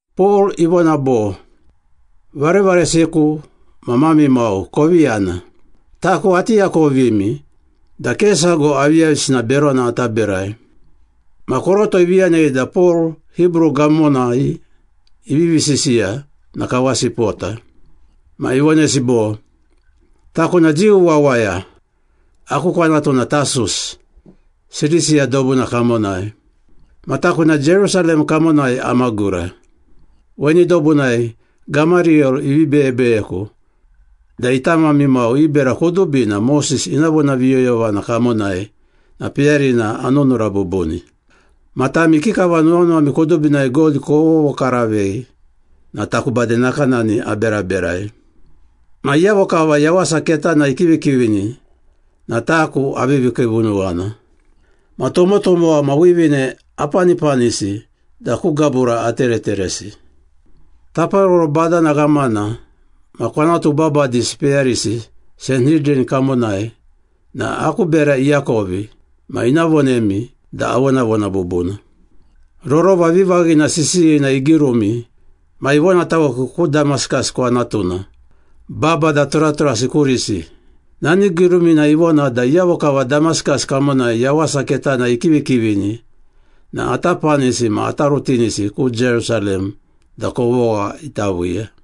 Pol ivona bo, “Varevaresiku ma mami mau kovi yana. Taku ati akovimi da ke sago aviyavisina berona ata berai.” Ma koroto ivi yanei da Pol Hibru gamonai ivivi sisiya na kawasi ipota. Ma ivonesi bo, “Taku na Jiu wawaya, aku kwanatu na Tasus, Silisiya dobuna kamonai. Ma taku na Jerusalem kamonai amagura. Weni dobunai Gamariyel ivi beyebeyeku da ita mami mau i bera kudubina Moses ina vonaviyoyovana kamonai na peyarina anunura bubuni. Ma tami ikikava nuwanuwami kudubinai God kovovokaravei na taku bade nakanani aberaberai. Ma iyavo kava Yawasa Ketana ikivikivini na taku avivi kiivunuwana. Ma tomotomowa ma wivine apanipanisi da ku gabura atereteresi. Taparoro badana ghamana ma kwanatu babadisi peyarisi Sanhidran kamonai na aku bera iakovi ma ina vonemi da avonavona bubuna. Rorova vivaghina sisiyina igirumi ma ivonataweku ku Damaskas kwanatuna, babada turaturasi kurisi. Nani girumina ivona da iyavo kava Damaskas kamonai Yawasa Ketana ikivikivini na ata panisi ma ata rutinisi ku Jerusalem da kovogha ita viiya.”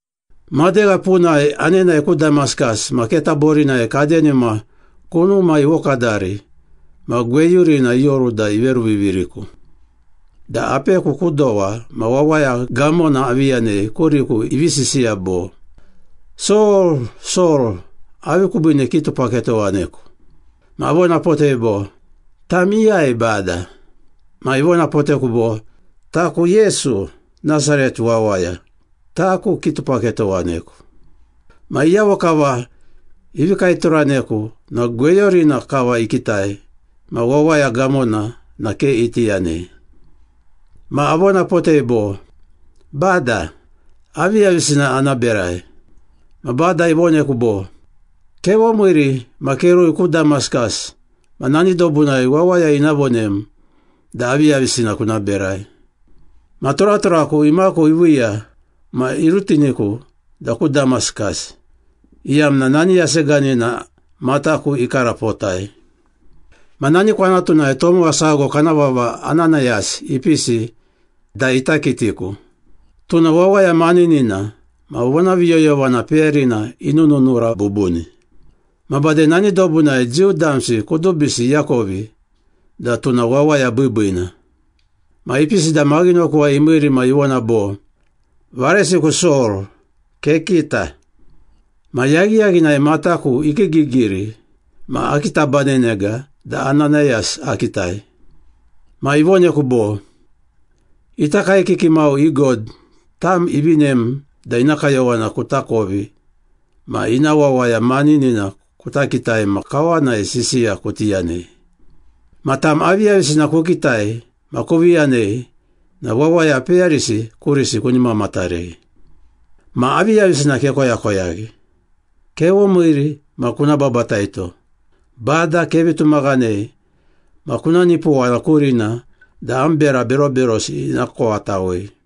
“Madegha punai anenae ku Damaskas ma keta borinai kadenima kunuma ivokadari ma gweyurina ioru da iveruviviriku, da apeku ku dowa ma wawaya gamona avi yanei kuriku ivi sisiya bo, ‘Sol, Sol, avi kubiine kitupaketowaneku?’ Ma avonapotei bo, ‘Tam iyai, Bada?’ Ma ivonapoteku bo, ‘Taku Yesu, Nasaret wawaya. Taku kitupaketowaneku.’ Ma iyavo kava ivi kaeturaneku na gweyurina kava ikitai ma wawaya gamona na ke iti yanei. Ma avonapotei bo, ‘Bada, aviyavisina ana berai?’ Ma Bada ivoneku bo, ‘Kevomiiri ma kerui ku Damaskas ma nani dobunai wawaya ina vonem da aviyavisina kuna berai.’ Ma turaturaku imaku iviiya ma irutiniku da ku Damaskas, iyamna nani yaseganina mataku ikarapotai.” “Ma nani kwanatunai tomowa sago kana vava Ananayas ipisi da ita kitiku. Tuna wawaya maninina ma vonaviyoyovana peyarina inununura bubuni. Ma bade nani dobunai Jiu damsi kudubisi iakovi da tuna wawaya biibiina. Ma ipisi da maghinokuwai imiiri ma ivona bo, ‘Varesiku Sol, kekita!’ Ma yaghiyaghinai mataku ikiigigiri ma akitabanenega da Ananayas akitai. Ma ivoneku bo, ‘Ita kaekiki mau i God tam ivinem da ina kayowana kutakovi ma ina Wawaya Maninina kuta kitai ma kawanai sisiya kuti yanei. Ma tam aviyavisina kukitai ma kuvi yanei na wawaya peyarisi kurisi kuni mamatarei. Ma aviyavisina kekoyakoyaghi? Kevomiiri ma kuna babataito. Bada kevi tumaghanei ma kuna nipowana kurina da am bera beroberosi ina kowatawei.’”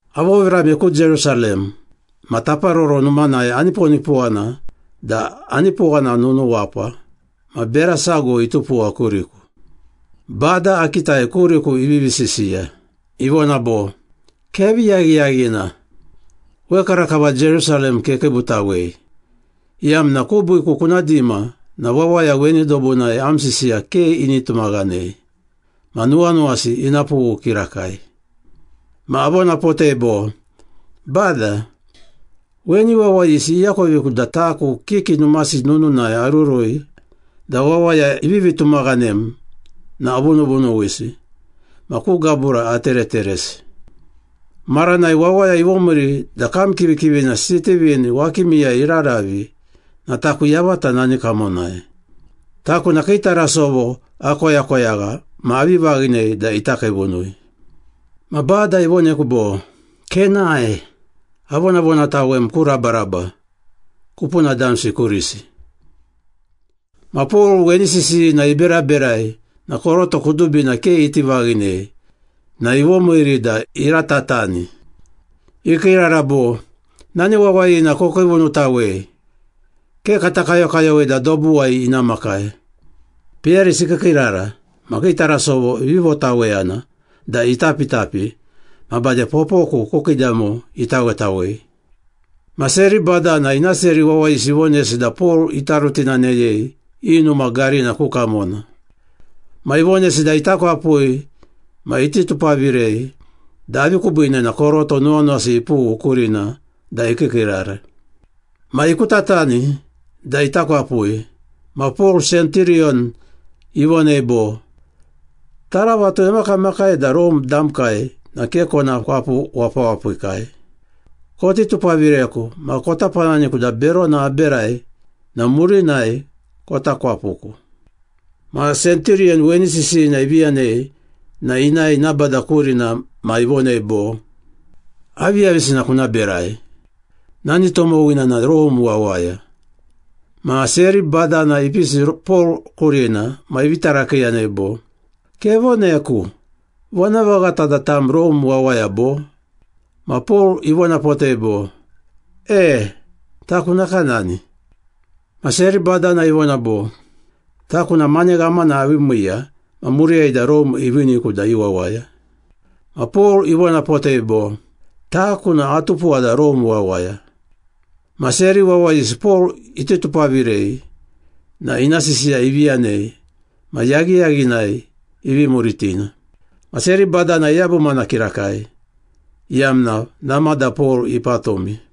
“Avovirame ku Jerusalem ma Taparoro Numanai aniponipowana da anipowana nunuwapa ma bera sago itupuwa kuriku. Bada akitai kuriku ivivi sisiya. Ivona bo, ‘Kevi yaghiyaghina! Wekarakava Jerusalem kekiibutawei, iyamna kubiiku kuna dima na wawaya weni dobunai am sisiya ke ini tumaghanei. Ma nuwanuwasi ina pughu kirakai.’ Ma avonapotei bo, ‘Bada, weni wawayisi iakoviku da taku kiki numasi nununai arurui da wawaya ivivi tumaghanem na avunuvunuwisi ma ku gabura atereteresi. Maranai wawaya ivomiiri da kam kivikivina Sitivin wakimiyai iraravi na taku yavata nani kamonai. Taku na kii tarasovo akoyakoyagha ma avi vaghinei da ita kiivunui.’ Ma Bada ivoneku bo, ‘Kenae. Avonavonatawem ku rabaraba, kupuna damsi kurisi.’” Ma Pol weni sisiyina iberaberai na koroto kudubina ke iti vaghinei na ivomiiri da iratatani. Ikiirara bo, “Nani wawayina kokiivunutawei, ke kata kayokayowei da dobuwai ina makai!” Peyarisi ikiikiirara ma kii tarasovo ivi votaweyana da itapitapi ma bade popoku ku kiidamo itawetawei. Ma seri badana ina seri wawayisi ivonesi da Pol ita rutinaneyei i numa garina ku kamona. Ma ivonesi da ita kwapui ma iti tupavirei da avi kubiine na koroto nuwanuwasi ipughu kurina da ikiikiirara. Ma ikutatani da ita kwapui, ma Pol senturiyon ivonei bo, “Taravatu emakamakai da Rome damkai na ke kona kwapu wapawapikai. Koti tupavireku ma kota pananiku da berona aberai na murinai kota kwapuku.” Ma senturiyon weni sisiyina ivi yanei na inae ina bada kurina ma ivonei bo, “Aviyavisina kuna berai? Nani tomowina na Rome wawaya.” Ma seri badana ipisi Pol kurina ma ivi tarakiiyanei bo, “Kevoneku. Vonavaghata da tam Rome wawaya bo?” Ma Pol ivonapotei bo, “E, taku nakanani.” Ma seri badana ivona bo, “Taku na mane ghamana avi miiya ma muriyai da Rome iviiniku da i wawaya.” Ma Pol ivonapotei bo, “Taku na atupuwa da Rome wawaya.” Ma seri wawayisi Pol iti tupavirei na ina sisiya ivi yanei ma yaghiyaghinai ivi muritina. Ma seri badana iyabumana kirakai, iyamna namada Pol ipatumi.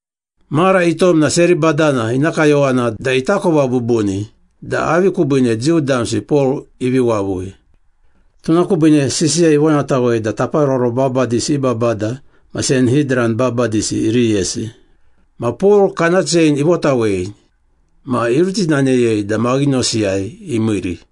Mara itom na seri badana ina kayowana da itakova bubuni da avi kubiine Jiu damsi Pol ivi wavui. Tuna kubiine sisiya ivonatawei da taparoro babadisi i babada ma Sanhidran babadisi iriyesi. Ma Pol kana chein ivotawei ma irutinaneyei da maghinosiyai imiiri.